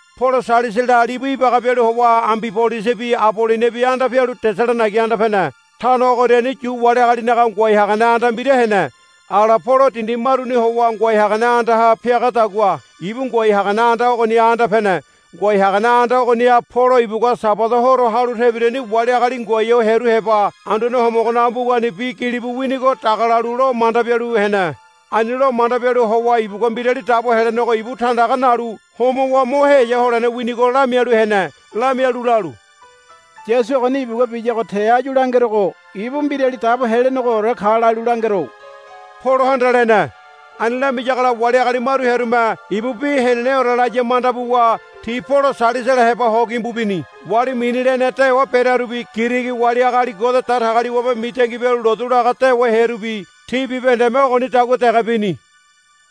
Polo Sailasala libu ibaga bialu howa Ambibolisibi Aboloniabi anda pialu Tesalonaiga anda pene. Tano ogoriani Yu wali agalinaga ngoai hagane anda mbira hene. Ala Polo dindi maruni howa ngoai hagane andaha piagadagua ibu ngoai hagane anda ogoniha anda pene. Ngoai hagane anda ogoniha Polo ibugua Sabada horo halu tebirani wali agali ngoai ho hearu heba Anduane Homogonaga mbugani bi gilibu winigo dagalalu lo manda bialu hene. Ani lo manda bialu howa ibugua Mbirali Dabo Helenego ibu tandaga nalu homowa mo heya holene winigo lamialu hene. Lamialu lalu, Yasu ogoni ibugua biyago te áyu langerogo ibu Mbirali Dabo Helenegoore ka lalu langero, Polohanda lene. Ani lamiyagola wali agali maru hearume, Ibu bi heneneore laya, manda buwa ti Polo Sailasala heba ho gimbu bini. Wali mini lene dewa berearubi Girigi wali agali Ngode Datagaliwabe mitangi bialu lotu laga dewa hearubi ti bibahendeme ogonidagua dege bini.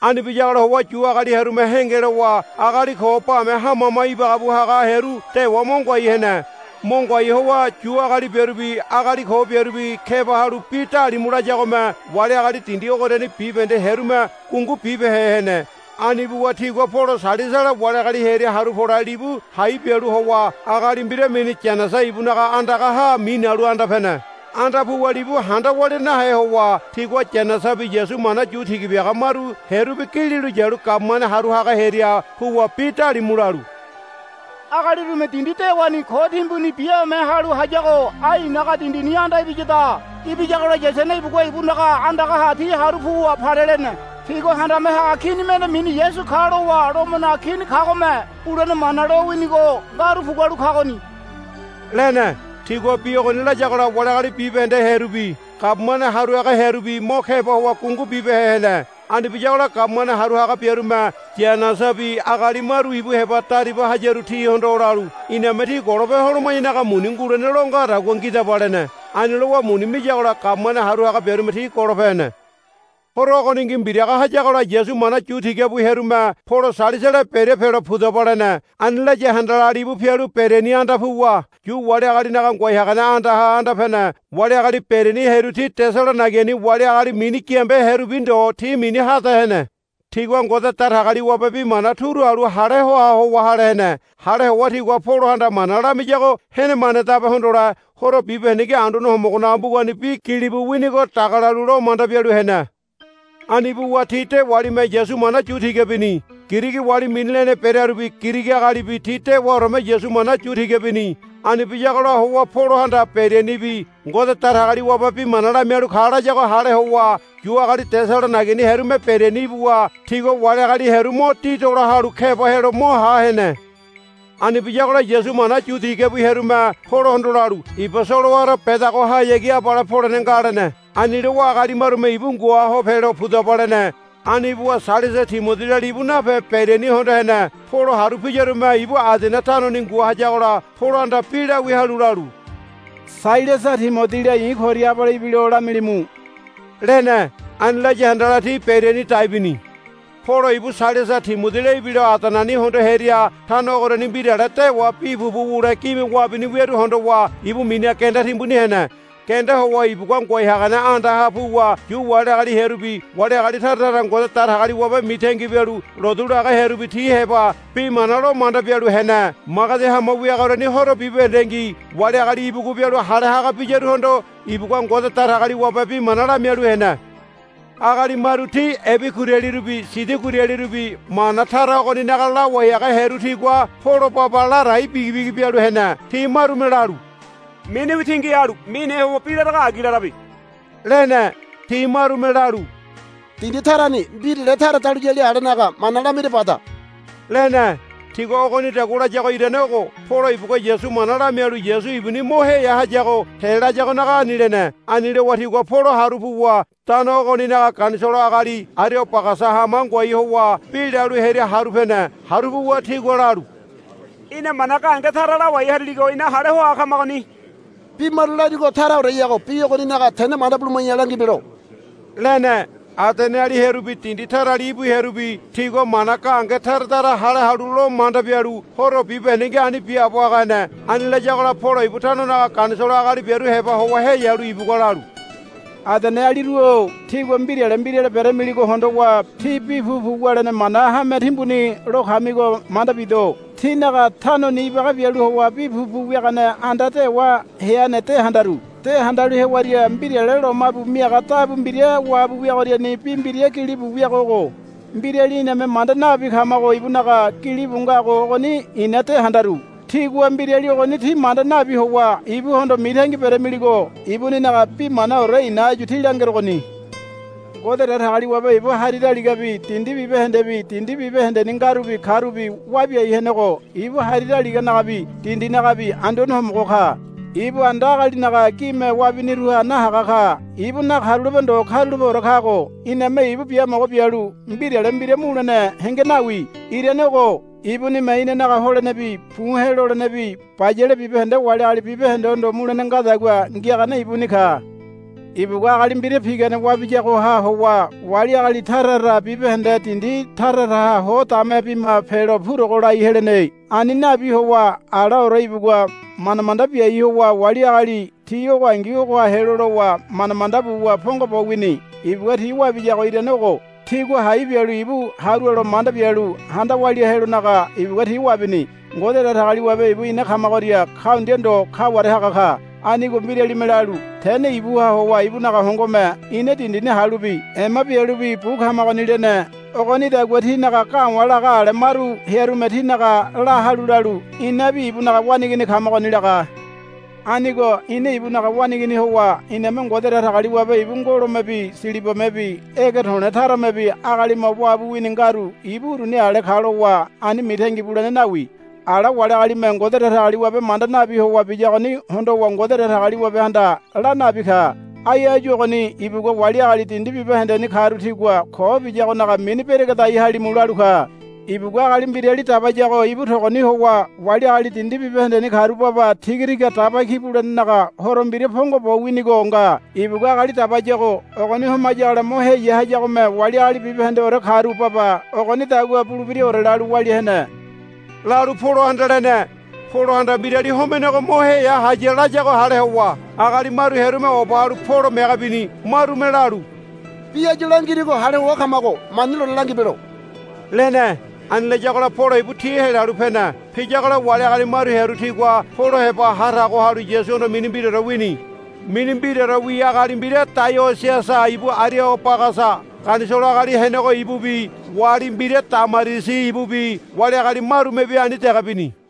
Ani biyagola howa Yu agali hearume henge lowa agali ko bame hama hama ibaga bu haga hearu dewa mo ngoai hene. Mo ngoai howa Yu agali biarubi agali ko biarubi keba halu bi dalimu layagome wali agali dindi ogoriani bibahende hearume gungu bibehe hene. Ani buwa tigua Polo Sailasala wali agali hearia haru pole libu hai bialu howa agali mbira mini Yaisana ibunaga andagaha minalu anda pene. Anda puwa libu handa walia nahe howa tigua Yaisanabi Yasu mana yu tiga biaga maru hearubi gililo yalu gabumane haru haga hearia puwa bi dalimu lalu, Agali urume dindi dewani ko timbuni biame halu hayago ai inanaga dindini anda ibiyada. Ibiyagola Yaisana ibugua ibunaga andagaha ti haru puwa palelene. Tigua handame haga kini mende mini Yasu ka lowa Lomonaga Kini kagome bulene mana lowinigo ngaru pugualu kagoni, lene. Tigua bi ogoni layagola wali agali bibahende hearubi gabumane haru haga hearubi mo keba howa gungu bibehe hene. Ani biyagola gabumane haru haga biarume Yaisanabi agali maru ibu heba dariba hayarubi tihondo lalu, Iname tí golope holoma̱yanaga muni ngulene lo ngadagua ngidaba, lene. Ani lowa muni miyagola gabumane haru haga biarume ti golope hene. Horo ogoningi mbiraga hayagola Yasu mana yu tiga bu hearume Polo Sailasala Beria pelo, Pudaba, lene. Ani laya handala libu pialu Beriani anda puwa Yu wali agalinaga ngoai hagane andaha anda pene. Wali agali Beriani hearu ti Tesalonaigani wali agali mini giambe hearubi ndo ti mini hade hene. Tigua Ngode Datagaliwabe bi mana turu halu hale hoa howa hale hene. Hale howa tigua Polohanda mana lamiyago henemanedabe hondole horo bibahendengi Anduane Homogonaga mbugani bi gilibu winigo dagalalu lo manda bialu hene. Ani buwa ti dewalime Yasu mana yu tiga bini. Girigi wali mini lene berearubi Girigi agalibi ti dewaoreme Yasu mana yu tiga bini. Ani biyagola howa Polohanda Berianibi Ngode Datagaliwabe bi mana lamialu ka layago hale howa Yu agali Tesalonaigani hearume Beriani ibuwa tigua wali agali hearu mo didola halu keba helo mo ha hene. Ani biyagola Yasu mana yu tiga bu hearume Polohondo lalu, Iba solowara bedagohayagi abale polene nga, lene. Ani lowa agali marume ibu ngua ho pelo, Pudaba, lene. Ani buwa Sailasa Timodila libu nape Beriani hondo hene. Polo haru piyarume ibu Adene tanoni ngua hayagola Polohanda bi lawia halu lalu, Sailasa Timodila i̱ koria abale ibilo lamilimu, lene. Ani laya handala ti Beriani dai bini. Polo ibu Sailasa Timodila ibilo Adeneni hondo hearia tano ogoriani mbirale dewa bi pupu wule gime wabini wiaru hondowa ibu miniha genda timbuni hene. Genda howa ibugua ngoai hagane andaha puwa Yu wali agali hearubi wali agali tara tara Ngode Datagaliwabe mitangi bialu lotu laga hearubi ti heba bi mana lo manda bialu hene. Magedi hama wiagoriani horo bibahendengi wali agali ibugu bialu hale haga biyaruhondo ibugua Ngode Datagaliwabe bi mana lamialu hene. Agali maru ti Ebigurialirubi Sidoigialirubi mana tara ogoninaga lawai haga hearu tigua Polo baba ladai bigibigi bialu hene. Ti marume lalu, Miniwi tingi halu mine howa bi larago agi larabe, lene. Ti marume lalu, Dindi tarani mbirale tara dahuliyali alenaga mana lamira bada, lene. Tigua ogonidagua layago irane ogo. Polo ibugua Yasu mana lamialu Yasu ibuni mo heya hayago te layagonaga ani lene. Ani lowa tigua Polo haru puwa tano ogoninaga ganisolo agali Ariobagasa hama ngoai howa bi lalu hearia haru pene. Haru puwa tigua lalu, Í̠na mana gahenge tara lawai hariligo ina hale hoa kamagoni. Bi maru larigo taraoreyago bi ogoninaga tene manda buluma̱ya langibelo, lene. Adeneali hearubi dindi tarali íbu hearubi tigua mana gahenge tara tara hale halu lo manda bialu horo bibahendengi ani biaabo haga hene. Ani layagola Polo ibu tanonaga ganisolo agali biaru heba howa heyalu ibugua lalu, Adenealiru-o tígua mbirale mbirale beramiligo hondowa tí bi pupu wulene mana hame timbuni lo kamigo manda bido. Tínaga tanoni ibaga bialu howa bi pupu wiagane anda dewa heane de handaru. De handalu hewaria mbirale lomabu miaga dabu mbira wabu wiagoriani bi mbira gilibu wiago ogo, Mbirali iname manda nabi kamago ibunaga, gilibu ngago ogoni i̱na de handaru. Tígua mbirali ogoni tí manda nabi howa ibuhondo mitangi beramiligo ibuninaga bi manaore i̱na áyu tí langerogoni. Ngode Datagaliwabe ibu hari daligabi dindi bibahendebi dindi bibahendeni ngarubi karubi wabiai henego ibu hari daligahanagabi dindihanagabi Anduane Homogo ka. Ibu anda agalinaga gime wabiniruha nahaga ka. Ibu nakarulape ndo karulapeore kago iname ibu biamogo bialu mbirale mbira mulene henge nawi. Irane ogo. Ibunime inanaga holenebi buhe̱ lolenebi bayale bibahende wali agali bibahendehondo mulene ngadagua ngiagane ibuni ka. Ibugua agali mbira pigane wabiyagoha howa wali agali tara tara bibahende dindi tara taraha ho dame bima pelo purogo lai helene. Ani nabi howa alaore ibugua manda manda biai howa wali agali ti ogongi ogoha helo lowa manda manda buwa pongo bo wini. Ibugua ti wabiyago irane ogo. Tigua hai bialu ibu harualo manda bialu handa walia helonaga ibugua ti wabini. Ngode Datagaliwabe ibu ina kamagoria kaundia ndo kaware haga ka. Anigo mbiralime lalu, Tene ibuha howa ibunaga hongome ina dindini halubi ema bialubi bu kamagoni, lene. Ogonidagua tínaga ga̱wa̱ laga ale maru hearume tínaga la halu lalu, Inabi ibunaga waneigini kamagoni, laga. Anigo ina ibunaga waneigini howa iname Ngode Datagaliwabe ibu ngolomebi silibamebi ege to̱le̱ taramebi agalime wabu wini ngaru ibu uruni ale ka lowa ani mitangi bulene nawi. Ala wali agalime Ngode Datagaliwabe manda nabi howa biyagoni hondowa Ngode Datagaliwabehanda la nabi ka. Ai áyu ogoni ibugua, Wali agali dindi bibahendeni karu tigua ko biyagonaga mini beregedai halimu, lalu ka. Ibugua agali mbirali dabayago ibu togoni howa wali agali dindi bibahendeni karu baba tigatiga daba ki bulenenaga horo mbira pongo bo winigo nga. Ibugua agali dabayago ogoni homayagola mo heya hayagome wali agali bibahendeore karu baba ogonidagua bulebiraore lalu walia hene, lalu Polohanda lene. Polohanda mbirali homenego mo heya haya layago hale howa agali maru hearume oba halu Polo mege bini. Marume lalu, Bi áyu langirigo hale hoa kamago mani lone langibelo, lene. Ani layagola Polo ibu ti helalu pene. Piyagola wali agali maru hearu tigua Polo heba ha tago halu Yasuhondo mini mbiraore wini. Mini mbiraorewi agali mbira Daionisiasa ibu Ariobagasa ganisolo agali henego ibubi wali mbira Damarisi ibubi wali agali marumebi ani dege bini.